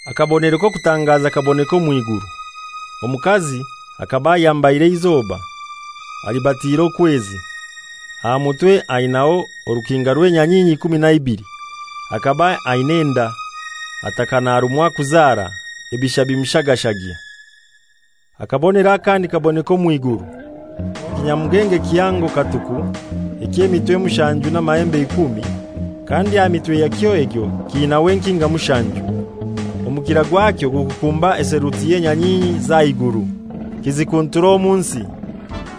Akabonero k'okutangaza kaboneka omw'iguru. Omukazi akaba ayambaire eizoba, alibatiire okwezi, aha mutwe ainaiho orukinga rw'enyanyinyi ikumi na ibili. Akaba ainai enda, ataka narumwa kuzara, ebisha bimushagashagya. Akabonero akandi kaboneka omw'iguru. Ekinyamugenge kihango katuku, eky'emitwe mushanju n'amahembe ikumi, kandi aha mitwe yakyo egyo kiinaho enkinga mushanju. Omukira gwakyo gukukumba etheluti y'enyanyinyi z'aha iguru, kizikuntura omu nsi.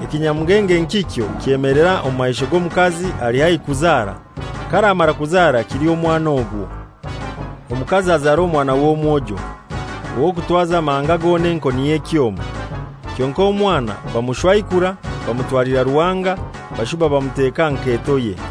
Ekinyamugenge nkikyo kyemelera omu maisho g'omukazi ali haihi kuzara, k'aramara kuzara kilye omwana ogwo. Omukazi azara omwana w'omwojo, ow'okutwaza amahanga goona enkoni y'ekyoma, kyonkai omwana bamushwaikura bamutwalira Ruhanga bashuba bamuteka aha nketoye.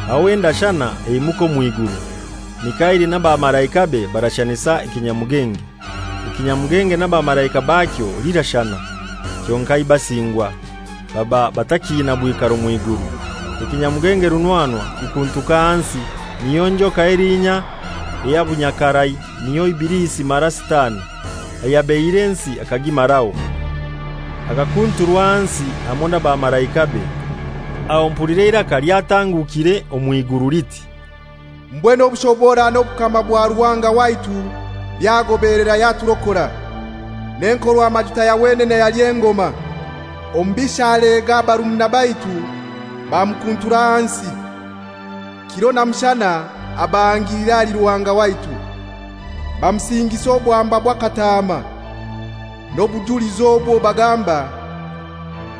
Aho endashana eimuka omw'iguru. Mikaili n'abamalaikabe barashanisa ekinyamugenge. Ekinyamugenge n'abamalaika bakyo lirashana, kyonkai basingwa, baba batakiina bwikaro mw'iguru. Ekinyamugenge runwanwa kikuntuka ahansi, niyo njoka elinya ey'obunyakarai, n'iwe Ibilisi mara Sitani, ayabeihire ensi akagimaraho, akakunturwa ahansi hamoi n'abamalaikabe. Aho mpulira eiraka lyatangukire omw'iguru liti, «Mbwenu obushobora n'obukama bwa Ruhanga waitu byagobelera yaturokora, n'Enkorwamajuta ya wenene yaly'engoma: omubisha alega barumuna baitu bamukuntura ahansi, kiro na mushana abahangilira ahali Ruhanga waitu. Bamusingisa obwamba bwa Kataama, n'obujulizi obwo bagamba,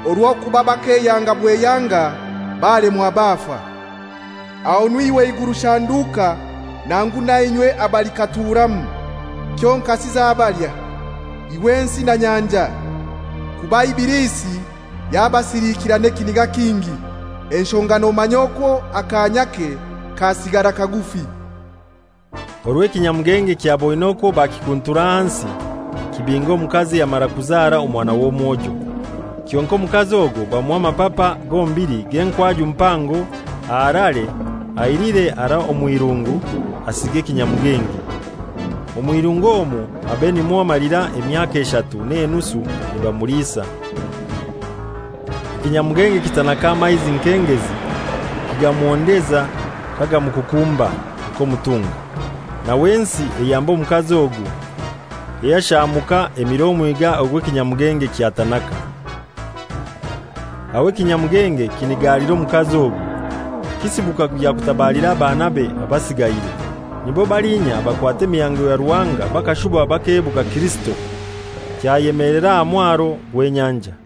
orw'okuba bakeyanga bweyanga balemwa bafa. Ahonu iwe iguru shanduka nangu nainywe abalikaturamu! Kyonkasi zabalya, iwe nsi na nyanja, kuba Ibilisi yabasiliikira n'ekiniga kingi, enshonga nomanya okwo akaanyake kasigara kagufi!» Orwo ekinyamugenge kyaboine okwo bakikuntura ahansi, kibinga omukazi ayamara kuzara omwana w'omwojo. Kyonkai omukazi ogwo bamuha amapapa gombili g'enkwaju mpango aharare ailire harai omw'irungu asinge ekinyamugenge. Omw'irungu omwo abe nimwo amalira emyaka eshatu n'enusu nibamuliisa. Ekinyamugenge kitanaka amaizi nk'engezi, kigamuhondeza kagamukukumba nk'omutunga. Nawe ensi eyamba omukazi ogwo, eyashaamuka emira omwiga ogw'ekinyamugenge kyatanaka. Aho ekinyamugenge kinigalira omukazi ogwo, kisibuka kugya kutabalira abaanabe abasigaire, nibo balinya abakwata emihango ya Ruhanga bakashuba bakebuga Kirisito. Kyayemelera aha mwaro gw'enyanja.